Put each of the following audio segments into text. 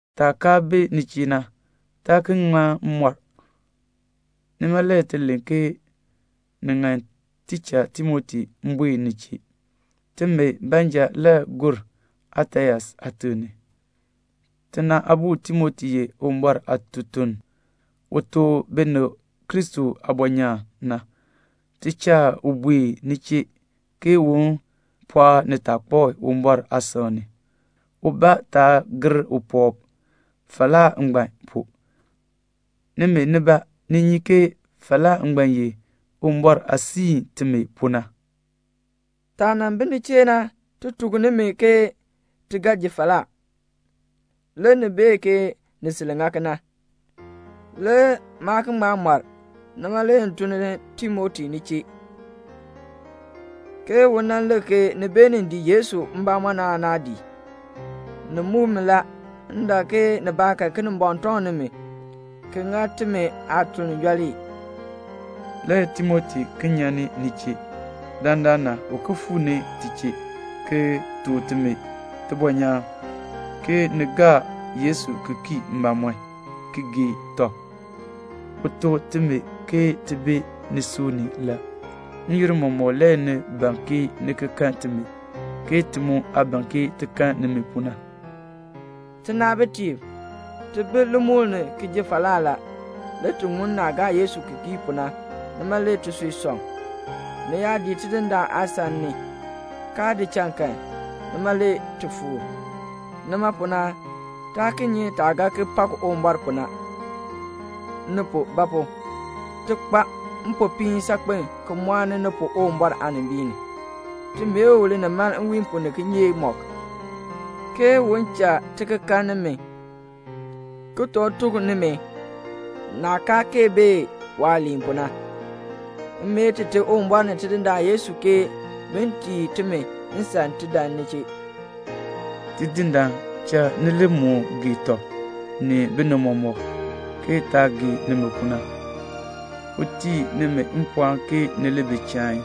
Taah kaa bi ni chee na, taa ki ŋma mɔr, nima le ti len ke ni ŋan ti cha Timoti buen ni chee. Timi baanja le gur Atens aatiŋ ni. Tina aabo Timoti ye Uwumbɔr aatutuln, u tuk binib Kristo aabɔnyaan na. Ti cha u buen ni chee ke un pɔɔk nitaakpab Uwumbɔr aasan ni, ubaa taa gir puwɔb falaa ngbaan pu. Nimi nibaa, ni nyi ke falaa ngbaan ye Uwumbɔr aah siin timi pu na. Taah nan bi ni chee na ti tuk nimi ke ti ga ji falaa. Le ni bee ke ni sil ŋa kena. Le maa ki ŋma mɔr. Nima le m cha Timoti buen ni chee, ke m bee ke ni beenin gaa Yesu ki kii aan naa gaa. Ni muk mi la, m dak ke nibaakan Kinimbɔŋ tɔŋ nimi, ki ŋa timi aatuln yooli. Le Timoti ki nyan ni ni chee; dandana u ki fuu ni ti chee, ki tuk timi tibɔnyaan, ke ni gaa Yesu ki kii mbamɔm, ki gee tɔb. U tuk timi ke ti bi nisui ni la. N-yoonn mɔmɔk le ni ban ni ki kan timi, ke ti mu aah ban ke ti kan nimi pu na. Tinaabitiib, ti bi limukl ni ki ji falaa la; le ti ŋun naah gaa Yesu ki kii pu na, nima le tisui sɔŋ. Ni yaa dii Tidindaan aasan ni, kaa di cha kan, nima le ti fuur. Nima pu na taa ki nyi taah ga ki pak Uwumbɔr pu na, ni pu; ba pu? ti kpa mpopiin saakpen ki mɔɔni ni pu Uwumbɔr aanimbiin ni. Ti mee u linimaln nwiin pu ni kinyeek mɔk ke un cha ti ki kan nimi ki toor tuk nimi naah kaa kee bee waaliin pu na. M mee Tite Uwumbɔr ni Tidindaan Yesu ke bin tii timi nsan ti dan ni chee. Tidindaan cha ni li moo gee tɔb ni binib mɔmɔk, ke taah gee nimi pu na. Un tii nimi mpɔɔn ke ni li bi chain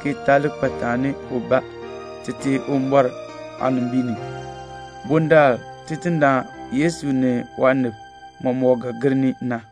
ki taa li kpa taani ubaa Tite Uwumbɔr aanimbiin ni, bundaln Tidindaan Yesu ni waanib mɔmɔk ga gir ni na.